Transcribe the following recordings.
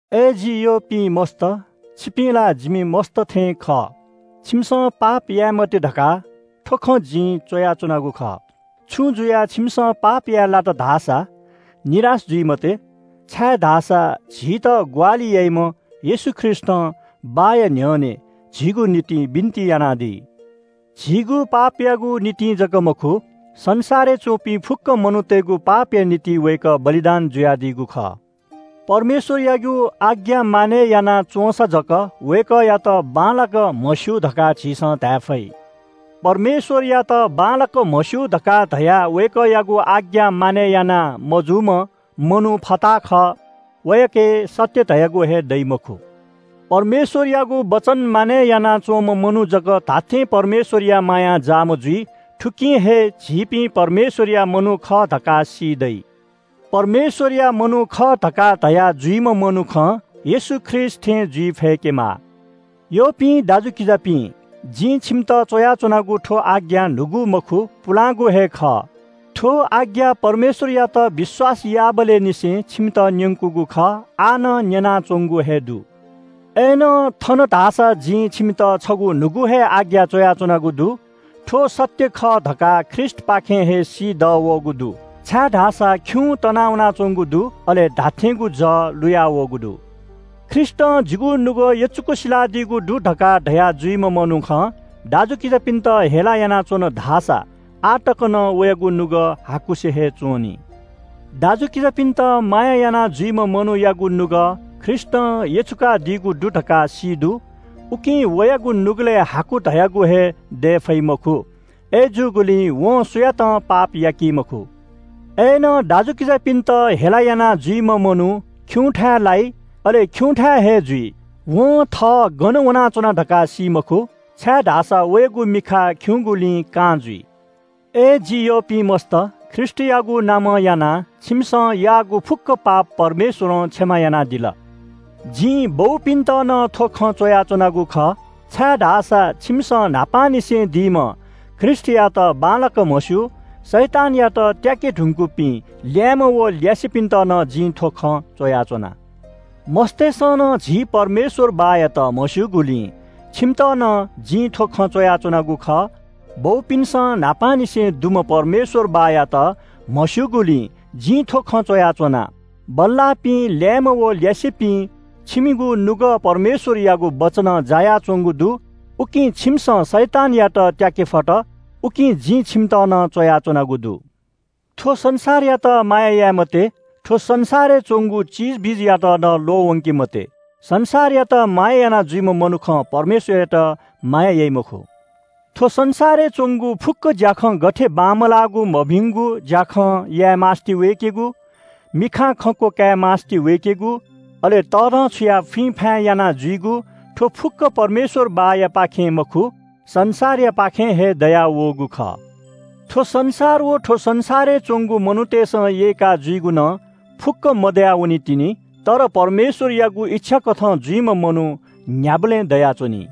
अय् जि यःपिं मस्‍त, छिपिं ला जिम्‍ह मस्‍त थें खः। छिमिसं पाप याये मते धकाः थ्‍व खँ जिं च्‍वयाच्‍वनागु खः। छुं जुयाः छिमिसं पाप याये लात धाःसा निराश जुइ मते, छाय्‌धाःसा झीत ग्‍वाहालि याइम्‍ह येशू ख्रीष्‍टं बाःया न्‍ह्यःने झीगु निंतिं बिन्‍ति यानादी। झीगु पापयागु निंतिं जक मखु, संसारय् च्‍वंपिं फुक्‍क मनूतय्‌गु पापया निंतिं वय्‌कः बलिदान जुयादीगु खः। परमेश्‍वरयागु आज्ञा मानय् याना च्‍वंसा जक वय्‌कःयात बांलाक म्‍हस्‍यू धकाः झीसं धाये फइ। परमेश्‍वरयात बांलाक म्‍हस्‍यू धकाः धयाः वय्‌कःयागु आज्ञा मानय् याना मजूम्‍ह मनू फताहा खः। वयाके सत्‍य धयागु हे दइ मखु। परमेश्‍वरयागु वचन मानय् यानाच्‍वंम्‍ह मनू जक धात्‍थें परमेश्‍वरया मायां जाःम्‍ह जुइ। थुकिं हे झीपिं परमेश्‍वरया मनू खः धकाः सी दइ। परमेश्‍वरया मनू खः धकाः धया जुइम्‍ह मनुखं येशू ख्रीष्‍ट थें जुइ फय्‌केमाः। यःपिं दाजुकिजापिं, जिं छिमित च्‍वयाच्‍वनागु थ्‍व आज्ञा न्‍हूगु मखु, पुलांगु हे खः। थ्‍व आज्ञा परमेश्‍वरयात विश्‍वास याःबलय् निसें छिमित न्‍यंकूगु खः, आः नं न्‍यनाच्‍वंगु हे दु। अय्‌नं थन धाःसा जिं छिमित छगू न्‍हूगु हे आज्ञा च्‍वयाच्‍वनागु दु। थ्‍व सत्‍य खः धकाः ख्रीष्‍टपाखें हे सी दःवःगु दु, छाय्‌धाःसा खिउँ तना वनाच्‍वंगु दु, अले धात्‍थेंगु जः लुयावःगु दु। ख्रीष्‍टं जिगु नुगः यचुक सिलादीगु दु धकाः धया जुइम्‍ह मनुखं दाजुकिजापिन्‍त हेला यानाच्‍वन धाःसा आः तक नं वयागु नुगः हाकुसे हे च्‍वं नि। दाजुकिजापिन्‍त माया यानाजुइम्‍ह मनूयागु नुगः ख्रीष्‍टं यचुकादीगु दु धकाः सी दु, उकिं वयागु नुगलय् हाकु धयागु हे दये फइ मखु। अय्‌जूगुलिं वं सुयातं पाप याकी मखु। अय्‌नं दाजुकिजापिन्‍त हेला यानाजुइम्‍ह मनू खिउँथाय् लाइ। अले खिउँथाय् हे जुइ। वं थः गन वनाच्‍वना धकाः सी मखु, छाय्‌धाःसा वयागु मिखा खिउँगुलिं कां जुइ। अय् जि यःपिं मस्‍त, ख्रीष्‍टयागु नामं यानाः छिमिसं याःगु फुक्‍क पाप परमेश्‍वरं क्षमा यानादिल। जिं बौपिन्‍त नं थ्‍व खँ च्‍वयाच्‍वनागु खः, छाय्‌धाःसा छिमिसं न्‍हापांनिसें दीम्‍ह ख्रीष्‍टयात बांलाक म्‍हस्‍यू। शैतानयात त्‍याके धुंकूपिं ल्‍याय्‌म्‍ह व ल्‍यासेपिन्‍त नं जिं थ्‍व खँ च्‍वयाच्‍वना। मस्‍तय्‌सं नं झी परमेश्‍वर बाःयात म्‍हस्‍यूगुलिं छिमित नं जिं थ्‍व खँ च्‍वयाच्‍वनागु खः। बौपिन्‍सं न्‍हापांनिसें दुम्‍ह परमेश्‍वर बाःयात म्‍हस्‍यूगुलिं जिं थ्‍व खँ च्‍वयाच्‍वना। बल्‍लाःपिं ल्‍याय्‌म्‍ह व ल्‍यासेपिं, छिमिगु नुगः परमेश्‍वरयागु वचनं जायाच्‍वंगु दु। उकिं छिमिसं शैतानयात त्‍याके फत। उकिं जिं छिमित नं च्‍वयाच्‍वनागु दु। थ्‍व संसारयात माया याये मते। थ्‍व संसारय् च्‍वंगु चिजबिजयात नं ल्‍वःवंके मते। संसारयात माया यानाजुइम्‍ह मनुखं परमेश्‍वरयात माया याइ मखु। थ्‍व संसारय् च्‍वंगु फुक्‍क ज्‍याखँ गथे बांमलाःगु मभिंगु ज्‍याखँ याये मास्‍ति वय्‌केगु, मिखां खंक्‍व काये मास्‍ति वय्‌केगु, अले तःधंछुयाः फुइँफाँय् यानाजुइगु। थ्‍व फुक्‍क परमेश्‍वर बाःयापाखें मखु, संसारयापाखें हे दयावःगु खः। थ्‍व संसार व थ्‍व संसारय् च्‍वंगु मनूतय्‌सं यय्‌का जुइगु नं फुक्‍कं मदया वनीतिनि। तर परमेश्‍वरयागु इच्‍छा कथं जुइम्‍ह मनू न्‍ह्याबलें दयाच्‍वनी।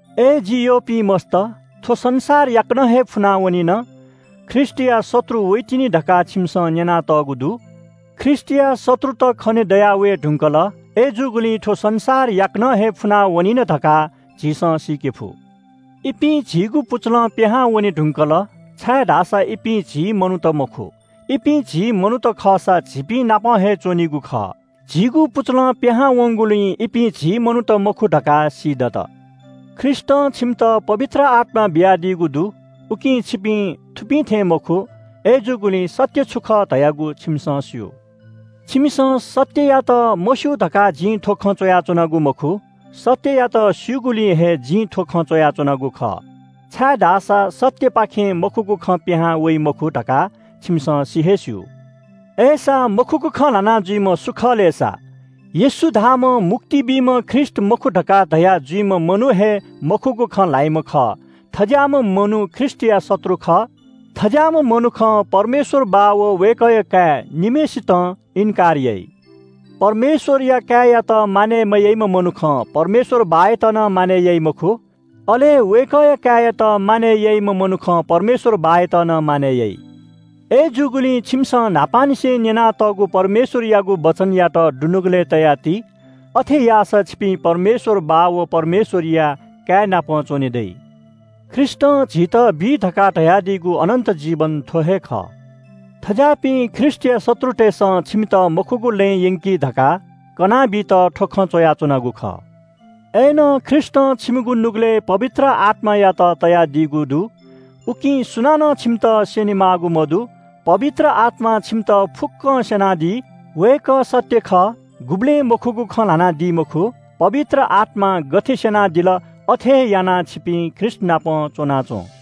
अय् जि यःपिं मस्‍त, थ्‍व संसार याकनं हे फुना वनिन। ख्रीष्‍टया शत्रु वइतिनि धकाः छिमिसं न्‍यनातःगु दु। ख्रीष्‍टया शत्रुत खने दयावये धुंकल। अय्‌जूगुलिं थ्‍व संसार याकनं हे फुना वनिन धकाः झीसं सीके फु। इपिं झीगु पुचलं पिहां वने धुंकल, छाय्‌धाःसा इपिं झी मनूत मखु। इपिं झी मनूत खःसा झीपिं नाप हे च्‍वनीगु खः। झीगु पुचलं पिहां वंगुलिं इपिं झी मनूत मखु धकाः सीदत। ख्रीष्‍टं छिमित पवित्र आत्‍मा बियादीगु दु, उकिं छिपिं थुपिं थें मखु। अय्‌जूगुलिं सत्‍य छु खः धयागु छिमिसं स्‍यू। छिमिसं सत्‍ययात मस्‍यू धकाः जिं थ्‍व च्‍वयाच्‍वनागु मखु। सत्‍ययात स्‍यूगुलिं हे जिं थ्‍व च्‍वयाच्‍वनागु खः, छाय्‌धाःसा सत्‍यपाखें मखुगु खँ पिहां वइ मखु धकाः छिमिसं सि हे स्‍यू। अय्‌सा मखुगु खँ ल्‍हाना जुइम्‍ह सु खः? येशू धाःम्‍ह मुक्ति बीम्‍ह ख्रीष्‍ट मखु धकाः धया जुइम्‍ह मनू हे मखुगु खँ ल्‍हाइम्‍ह खः। थज्‍याःम्‍ह मनू ख्रीष्‍टया शत्रु खः। थज्‍याःम्‍ह मनुखं परमेश्‍वर बाः व वय्‌कःया काय् निम्‍हय्‌सितं थःनाली मखु। परमेश्‍वरया काय्‌यात मानय् मयाइम्‍ह मनुखं परमेश्‍वर बाःयात नं मानय् याइ मखु। अले वय्‌कःया काय्‌यात मानय् याइम्‍ह मनुखं परमेश्‍वर बाःयात नं मानय् याइ। अय्‌जूगुलिं छिमिसं न्‍हापांनिसें न्‍यनातःगु परमेश्‍वरयागु वचनयात दुनुगलय् तयाति। अथे याःसा छिपिं परमेश्‍वर बाः व परमेश्‍वरया काय् नाप च्‍वने दइ। ख्रीष्‍टं झीत बी धकाः धयादीगु अनन्‍त जीवन थ्‍व हे खः। थज्‍याःपिं ख्रीष्‍टया शत्रुतय्‌सं छिमित मखुगु लँय् यंकी धकाः कनाबीत थ्‍व खँ च्‍वयाच्‍वनागु खः। अय्‌नं ख्रीष्‍टं छिमिगु नुगलय् पवित्र आत्‍मायात तयादीगु दु, उकिं सुनानं छिमित स्‍यने माःगु मदु। पवित्र आत्‍मां छिमित फुक्‍कं स्‍यनादी। वय्‌कः सत्‍य खः, गुबलें मखुगु खँ ल्‍हानादी मखु। पवित्र आत्‍मां गथे स्‍यनादिल, अथे हे यानाः छिपिं ख्रीष्‍टनाप च्‍वनाच्‍वँ।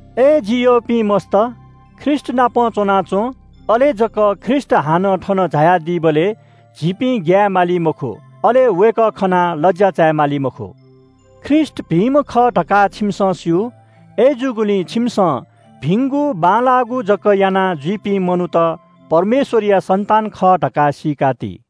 अय् जि यःपिं मस्‍त, ख्रीष्‍टनाप च्‍वनाच्‍वँ। अले जक ख्रीष्‍ट हानं थन झायादीबलय् झीपिं ग्‍याये माली मखु, अले वय्‌कः खनाः लज्‍या चाये माली मखु। ख्रीष्‍ट भिंम्‍ह खः धकाः छिमिसं स्‍यू। अय्‌जूगुलिं छिमिसं भिंगु बांलाःगु जक यानाजुइपिं मनूत परमेश्‍वरया सन्‍तान खः धकाः सीकाति।